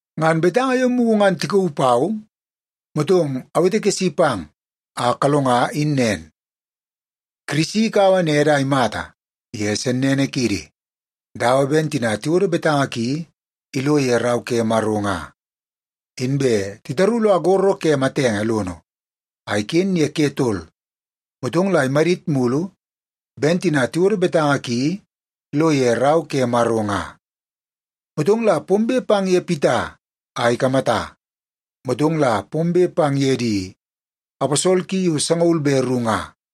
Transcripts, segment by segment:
Ngan betanga yo mugu ngan tikauu pau, motong awetekesi pang a kalonga in nen: Kirisi ikaua nede a imata ye sennene kiidi dawa ben tina tiwodo betanga ki ilo ye Rau ke Maro nga. Inbe titaru lo agoro ke matenge lono a iken ye ke tol, motong la imadit mulu ben tina tiwodo betanga ki lo ye Rau ke Maro nga. Motong la pombe pang ye Pita a ikamata, motong la pombe pang ye di aposol ki yo sangaul be ru nga.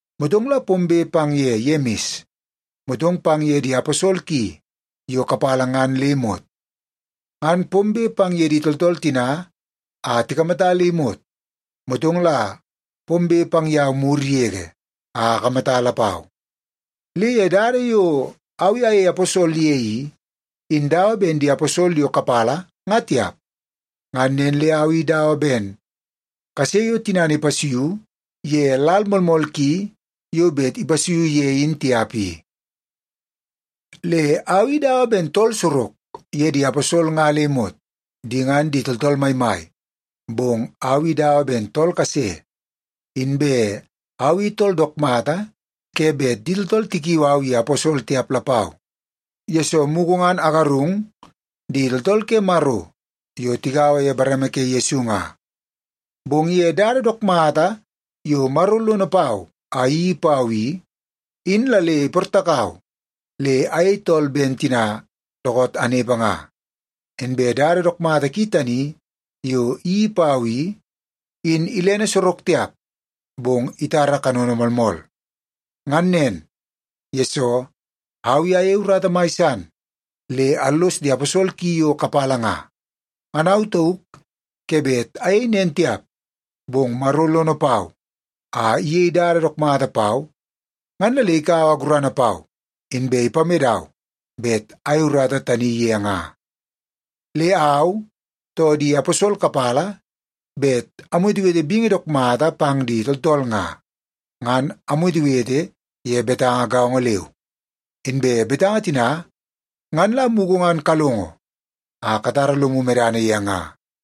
Motong la pombe pang ye Yemis, motong pang ye di aposol ki yo kapala ngan le imot. Ngan pombe pang ye di tooltool tina a tikamata le imot, motong la pombe pang yau mur yege a akamata lapau. Le ye dada yo au i ayei aposol ye i, in dawa ben di aposol yo kapala nga tiap. Ngan nen le au i dawa ben kase yo tinana ipasuiu ye lal moolmool ki yo bet ipasuiu ye in tiap i. Le au i dawa ben tool sorok ye di aposol nga le imot. Di ngan di tooltool maimai, bong au i dawa ben tool kase. Inbe au i tool dook mata ke bet di tooltool tikiu au ye aposol tiap lapau, yesoo mugu ngan agarung di tooltool ke Maro yo tigaua ye bareme ke Yesu nga. Bong ye dada dook mata yo Maro lono pau a iyeii pau i, in la le iportakau le ayei tool ben tina dookoot anepe nga. Inbe dada dook mata ki tani yo iyeii pau i, in ilene sorok tiap, bong itara kanono moolmool. Ngan nen, yesoo au i ayei urata mai san le allos di aposol ki yo kapala nga. Ngan au tauk ke bet ayei nen tiap, bong Maro lono pau a iyei dada dook mata pau ngan la le ikaua gurana pau, inbe ipamedau bet ayei urata tani ye nga. Le au, too di aposol kapala bet amwetewete bingi dook mata pang di tooltool nga, ngan amwetewete ye betanga gaongo leu. Inbe betanga tina ngan la mugu ngan kalongo a katara lomu medana ye nga.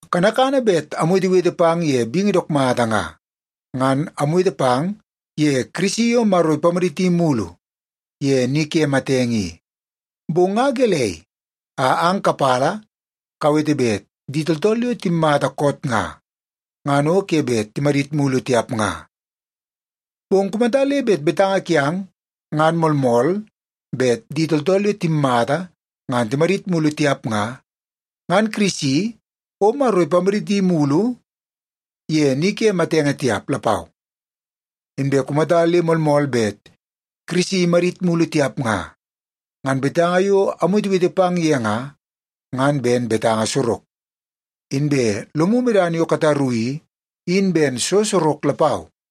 Kanakana bet amwetewete pang ye bingi dook mata nga, ngan amwete pang ye Kirisi yo Maro ipamaditi mulu ye ni ke matenge i. Bong nga gelei a ang kapala kawete bet di tooltool yo timmata koot nga, ngan o ke bet timadit mulu tiap nga? Bong kumata le betanga kiang ngan moolmool bet di tooltool yo timmata ngan timadit mulu tiap nga, ngan Kirisi o Maro ipamaditi mulu ye ni ke matenge tiap lapau. Inbe kumata le moolmool bet Kirisi imadit mulu tiap nga, ngan betanga yo amwetewete pang ye nga, ngan ben betanga sorok. Inbe lomu medana yo kataru i, in ben so sorok lapau.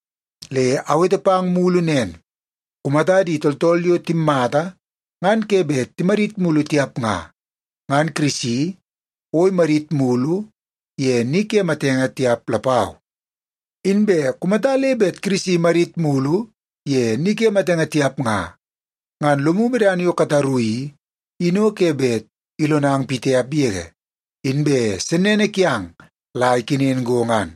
Le awete pang mulu nen, kumata di tooltool yo timmata ngan ke bet timadit mulu tiap nga, ngan Kirisi o imadit mulu ye ni ke matenge tiap lapau. Inbe kumata le bet Kirisi imadit mulu ye ni matenge tiap nga, ngan lomu medana yo kataru i, in o ke bet ilonang pitiap yege, inbe sennene kiang la ikenen go ngan.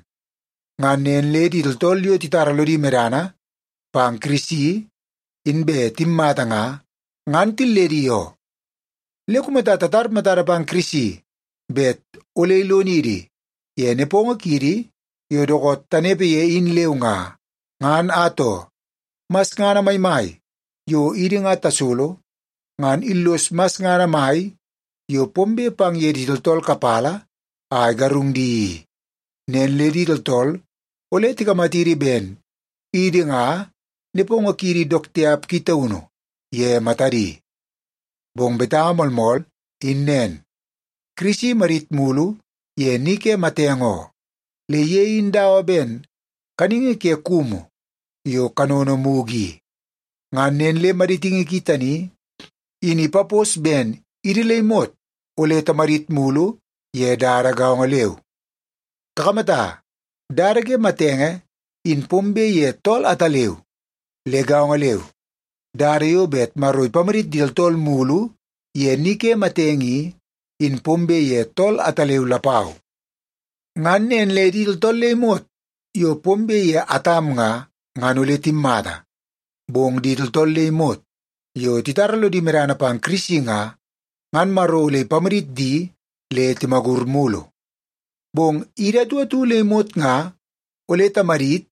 Ngan nen le di tooltool yo titara lodi medana pang Kirisi inbe timmata nga, ngan tilledi oo. Le kumata tatar matada pang Kirisi bet ole ilonidi ye nepongo kiidi yo dookoot tanepe ye in leu nga, ngan atoo, masngana maimai yo idi nga tasolo ngan illoso masngana mai yo pombe pang ye di tooltool kapala a igarung di i. Nen le di tooltool ole tikamatidi ben idi nga nepongo kiidi dook tiap ki taunu ye matadi. Bong betanga moolmool in nen, Kirisi imadit mulu ye ni ke matenge oo. Le ye in dawa ben kaningi ke kumu yo kanono mugu i. Ngan nen le maditingi ki tani in ipapos ben idi le imot ole timadit mulu ye dada gaongo leu. Kakamata, dada ke matenge in pombe ye tool ataleu. Le gaongo leu, dada yo bet Maro ipamadit di tooltool mulu ye ni ke matenge i, in pombe ye tool ataleu lapau. Ngan nen le di tooltool le imot yo pombe ye Atam nga, ngan ole timmata. Bong di tooltool le imot yo titara lodi medana pang Kirisi nga, ngan Maro ole ipamadit di le timagur mulu. Bong idi atu atu le imot nga ole tamadit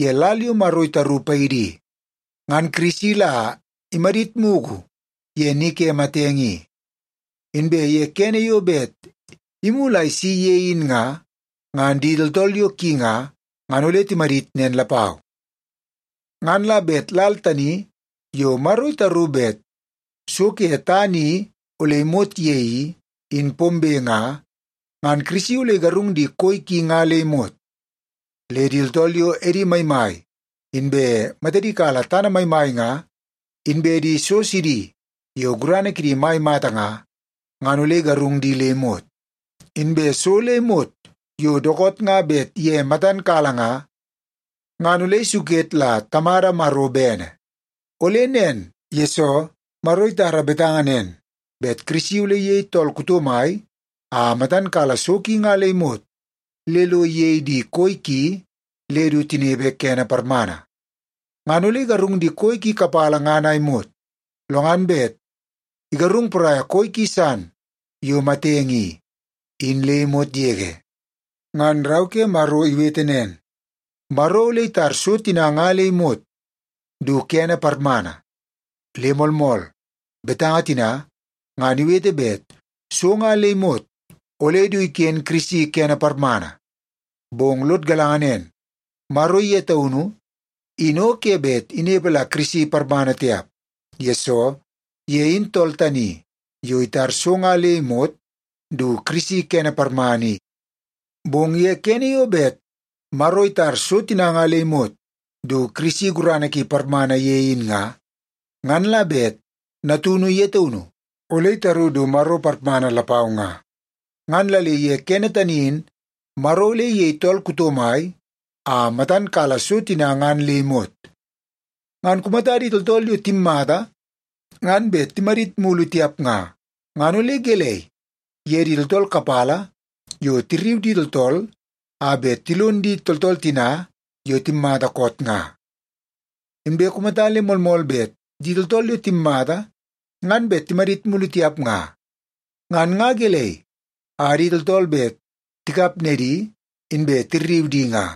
ye lal yo Maro itaru paidi i. Ngan Kirisi la imadit mugu ye ni ke matenge i. Inbe ye kene yo bet imulu a isi ye in nga, ngan di tooltool yo ki nga, ngan ole timadit nen lapau. Ngan la bet lal tani yo Maro itaru bet so ke tana i ole imot ye i, in pombe nga, ngan Kirisi ole igarung di koi ki nga le imot. Le di tooltool yo edi maimai inbe matadi kala tana maimai nga, inbe di so sidi yo gurana kidi mai mata nga, ngan ole igarung di le imot. Inbe so le imot yo dookoot nga bet ye matan kala nga, ngan ole isuket la Tamada Maro bene. Ole nen, yesoo Maro itara betanga nen bet Kirisi ole iyei tool kuto mai a matan kala so ki nga le imot le lo iyei di koi ki le du tinepe kene parmana. Ngan ole igarung di koi ki kapala ngan a imot, lo ngan bet igarung poraia koi ki san yo matenge i, in le imot yege. Ngan Rau ke Maro iwete nen, Maro ole itar “so tina nga le imot du kene parmana.” Le moolmool, betanga tina ngan iwete bet so nga le imot ole du iken Kirisi kene parmana. Bong lod galanga nen, Maro ye taunu in o ke bet inepe la Kirisi parmana tiap, yesoo ye in tool tani yo itar so nga le imot du Kirisi kene parmana i. Bong ye kene yo bet Maro itar so tina nga le imot du Kirisi gurana ki parmana ye in nga, ngan la bet Natunu ye taunu ole itaru du Maro parmana lapau nga. Ngan la le ye kene tani in Maro ole iyei tool kuto mai a matan kala so tina ngan le imot. Ngan kumata di tooltool yo timmata ngan bet timadit mulu tiap nga, ngan ole gelei ye di tooltool kapala yo tirriu di tooltool a bet tilon di tooltool tina yo timmata koot nga? Inbe kumata le moolmool bet di tooltool yo timmata ngan bet timadit mulu tiap nga, ngan nga gelei a di tooltool bet tikap nedi inbe tirriu di nga?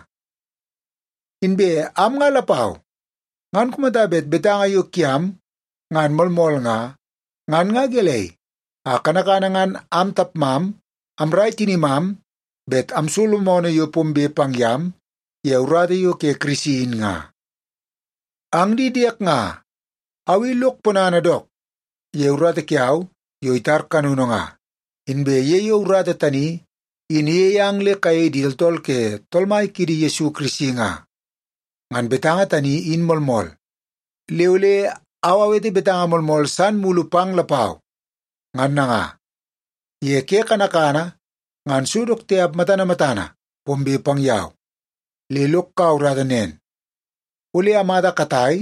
Inbe am nga lapau, ngan kumata bet betanga yo kiang ngan moolmool nga, ngan nga gelei a kanakana ngan am tapmam amrai tinimam bet amsolo moonoo yo pombe pang yam ye urata yo ke Kirisi in nga? Ang di diek nga, au i lok ponana dook ye urata kiau yo itar kanono nga, inbe ye yo urata tani in iyei ang le kayei di tooltool ke Tool Mai kiidi Yesu Kirisi nga. Ngan betanga tani in moolmool, le ole au awete betanga moolmool san mulu pang lapau. Ngan nanga, ye ke kanakana ngan so dook tiap matana matana pombe pang yau, le lok kaua urata nen, ole amata katai,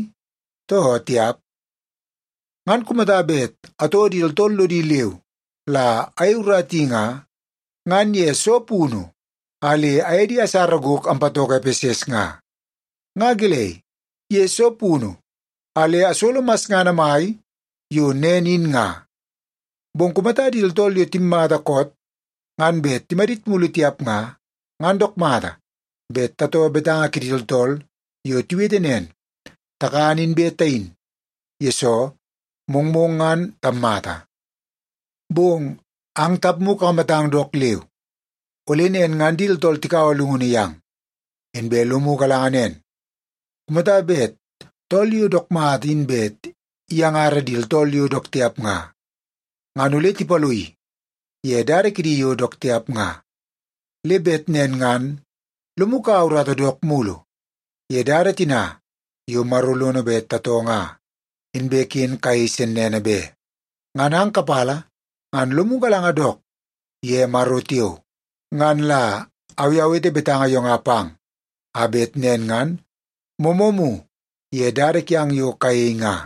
too tiap. Ngan kumata bet atoo di tooltool lodi leu la ayei urata i nga, ngan ye soo punu a le aye di asara gok ampatoko Epeses nga? Nga gelei, ye soo punu a le asolo masngana mai yo nen in, nga? Bong kumata di tooltool yo timmata koot ngan bet timadit mulu tiap nga, ngan dook mata bet tatoo betanga kidi tooltool yo tiwete nen, “Takan inbe tayin, yesoo mongmong ngan tammata.” Bong ang tapmu kakamatang dook leu, ole nen ngan di tooltool tikaua llungunu yang. Inbe lomu galanga nen, kumata bet tool yo dook mata in bet iyangara di tooltool yo dook tiap nga, ngan ole tipaloii ye dada kidi yo dook tiap nga. Le bet nen ngan lomu kaua urata dook mulu ye dada tina yo Maro lono bet tatoo nga, inbe ken kayei sennene be. Ngan ang kapala ngan lomu galanga dook ye Maro tiao. Ngan la au i awete betanga yo nga pang, a bet nen ngan moomoomu ye dada kiang yo kayei nga.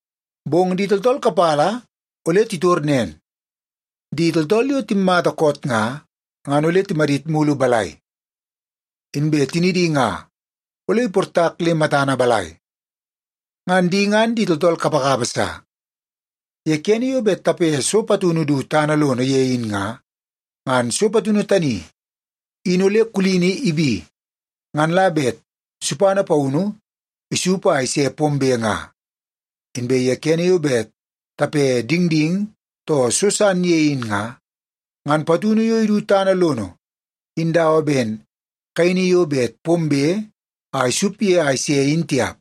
Bong di tooltool kapala ole titor nen, “Di tooltool yo timmata koot nga, ngan ole timadit mulu balai? Inbe tinidi nga ole iportak le matana balai?” Ngan di ngan tooltool kapakapa sa! Ye kene yo bet tape so patunu du tana lono ye in nga, ngan so patunu tani in ole kulini ibi ngan la bet supana paunu isup a ise pombe nga. Inbe ye kene yo bet tape dingding too so san ye in nga, ngan patunu yo idu tana lono in dawa ben kaini yo bet pombe a isup ye a ise in tiap.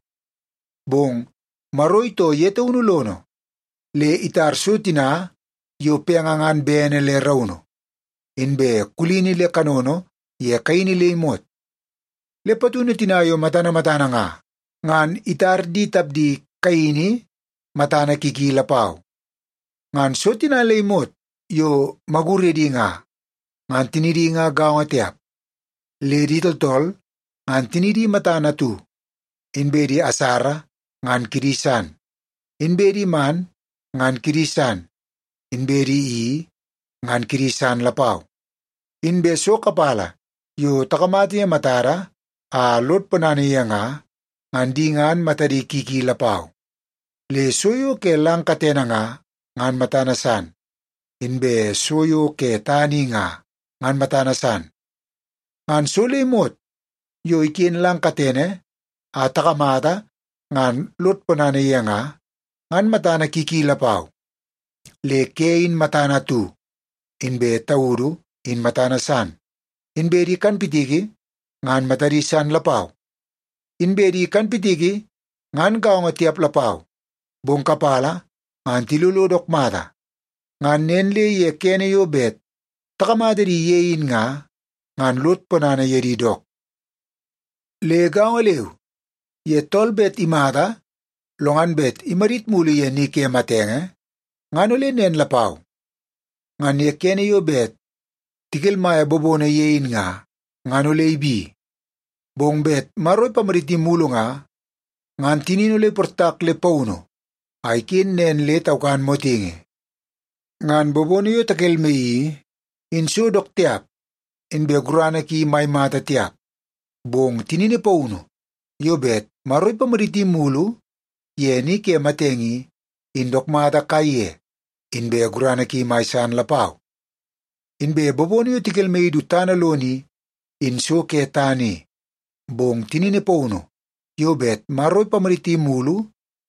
Bong Maro itoo ye taunu lono le itar so tina yo penge ngan bene le raunu, inbe kulini le kanono ye kaini le imot. Le patunu tina yo matana matana nga, ngan itar di tapdi kaini matana ki ki lapau. Ngan so tina le imot yo maguredi nga, ngan tinidi nga gaongo tiap. Le di tooltool ngan tinidi matana atu, inbe di asara ngan kidi san, inbe di man ngan kidi san, inbe di i ngan kidi san lapau. Inbe so kapala yo takamata ye matada a lod ponana ye nga, ngan di ngan matadi ki ki lapau. Le so yo ke lang katene nga, ngan matana san, inbe so yo ke tana i nga, ngan matana san. Ngan so le imot yo iken lang katene a takamata ngan lod ponana ye nga, ngan matana ki ki lapau. Le ke in matana atu, inbe taudu in matana san, inbe di kanpitiki ngan matadi san lapau. Inbe di kanpitiki ngan gaongo tiap lapau, bong kapala ngan tilolo dook mata, ngan nen le ye kene yo bet takamata di ye in nga, ngan lod ponana ye di dook. Le gaongo leu, ye tool bet imata lo ngan bet imadit mulu ye ni ke matenge ngan ole nen lapau. Ngan ye kene yo bet tikelmaia bobono ye in nga, ngan ole ibi. Bong bet Maro ipamaditi mulu nga, ngan tinini ole iportak le paunu a iken nen le taukan motingi. Ngan bobono yo takelmaii i, in so dook tiap inbe gurana ki mai mata tiap. Bong tinini paunu yo bet Maro ipamaditi mulu ye ni ke matenge i, in dook mata kaiye inbe gurana ki mai san lapau. Inbe bobono yo tikelmaii du tana lono i, in so ke tana i. Bong tinini paunu yo bet Maro ipamaditi mulu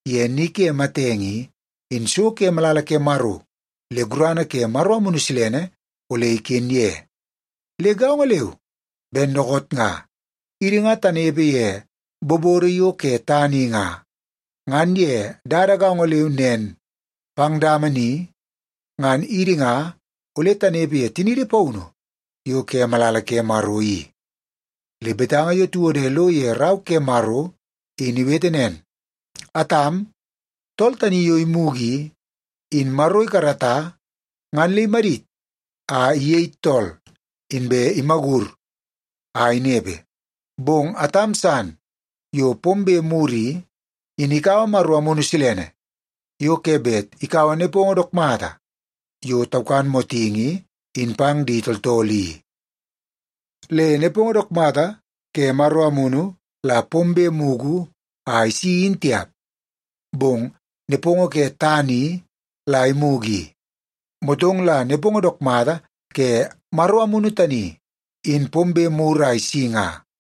ye ni ke matenge i, in so ke malala ke Maro le gurana ke Maro Amunu Silene ole iken ye. Le gaongo leu ben dookoot nga idi ngan tanepe ye bobodo yo ke tana i nga, ngan ye dada gaongo leu nen pang dama ni ngan idi nga ole tanepe ye tiniidi paunu yo ke malala ke Maro i. Le betanga yo tiwode lo ye Rau ke Maro in iwete nen, “Atam, tool tani yo imugu i, in Maro ikarata ngan le imadit a iyei tool, inbe imagur a inepe.” Bong Atam san yo pombe mur i, in ikaua Maro Amunu Silene yo ke bet ikaua nepongo dook mata yo taukan motingi in pang di tooltool i. Le nepongo dook mata ke Maro Amunu la pombe mugu a isi in tiap, bong nepongo ke tana i la imugu i. Motong la nepongo dook mata ke Maro Amunu tani in pombe mur a isi nga.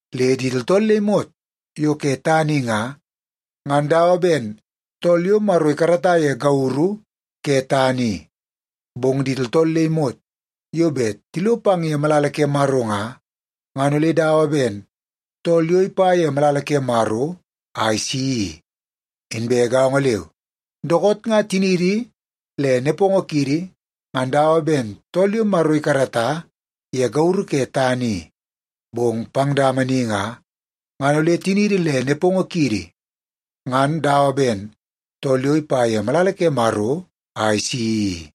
Le di tooltool le imot yo ke tana i nga, ngan dawa ben tool yo Maro ikarata ye gauru ke tana i. Bong di tooltool le imot yo bet tilo pang ye malala ke Maro nga, ngan ole dawa ben tool yo ipa ye malala ke Maro a isi i. Inbe gaongo leu, dookoot nga tiniidi le nepongo kiidi ngan dawa ben tool yo Maro ikarata ye gauru ke tana i. Bong pang dama ni nga, ngan ole tiniidi le nepongo kiidi ngan dawa ben tool yo ipa ye malala ke Maro a isi i.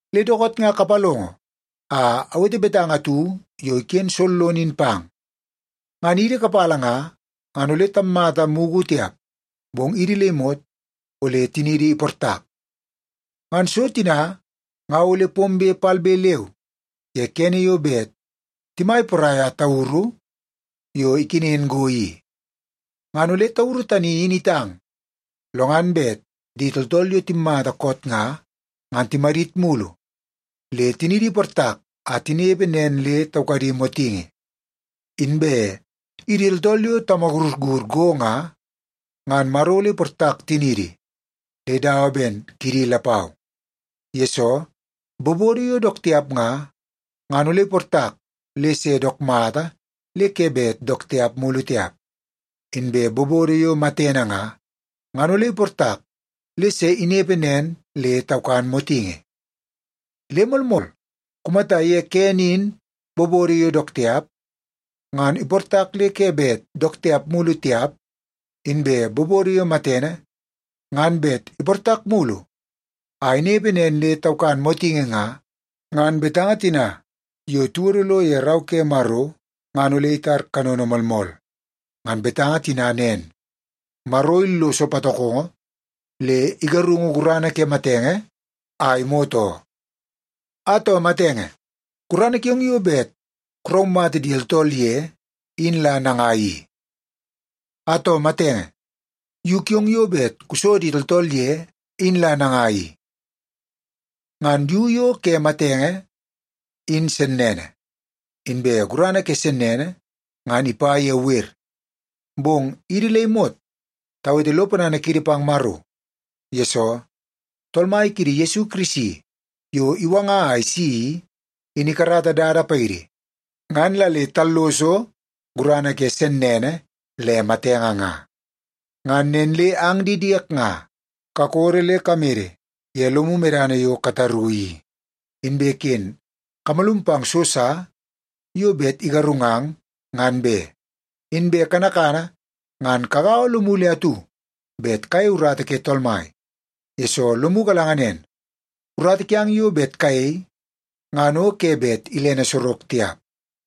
Le dookoot nga kapalongo a awete betanga atu yo iken sollono in pang. Ngan idi kapala nga, ngan ole tammata mugu tiap, bong idi le imot ole tiniidi iportak. Ngan so tina nga ole pombe palbe leu ye kene yo bet timai poraia tauru yo ikenen go i. Ngan ole tauru tani in itang lo ngan bet di tooltool yo timmata koot nga, ngan timadit mulu le tinidi iportak a tinepe nen le taukadi motingi. Inbe idi tooltool yo tamagurur go nga, ngan Maro ole iportak tiniidi le dawa ben kidi lapau. Yesoo, bobodo yo dook tiap nga, ngan ole iportak le se dook mata le ke bet dook tiap mulu tiap. Inbe bobodo yo matene nga, ngan ole iportak le se inepe nen le taukan motingi. Le moolmool, kumata ye kene in bobodo yo dook tiap, ngan iportak le ke bet dook tiap mulu tiap, inbe bobodo yo matene, ngan bet iportak mulu a inepe nen le taukan motingi nga, ngan betanga tina yo tiwodo lo ye Rau ke Maro ngan ole itar kanono moolmool. Ngan betanga tina nen, “Maro illoso patokongo, le igarungu gurana ke matenge a imot oo.” “Atoo matenge, gurana kiong yo bet kuraumata di tooltool ye in la nangai i? Atoo matenge, yu kiong yo bet kuso di tooltool ye in la nangai i?” Ngan yu yo ke matenge in sennene, inbe gurana ke sennene ngan ipa ye wer. Bong idi le imot tawete lo ponana kiidi pang Maro, yesoo Tool Mai kiidi Yesu Kirisi yo iwanga a isi i, in ikarata dada paidi ngan la le talloso gurana ke sennene le matenge nga. Ngan nen le ang di diek nga, kakodo le kamede ye lomu medana yo kataru i, inbe ken kamalum pang so sa yo bet igarungang ngan be. Inbe kanakana ngan kagaua lomu le atu bet kayei urata ke Tool Mai, yesoo lomu galanga nen, urata kiang yo bet kayei ngan o ke bet ilene sorok tiap.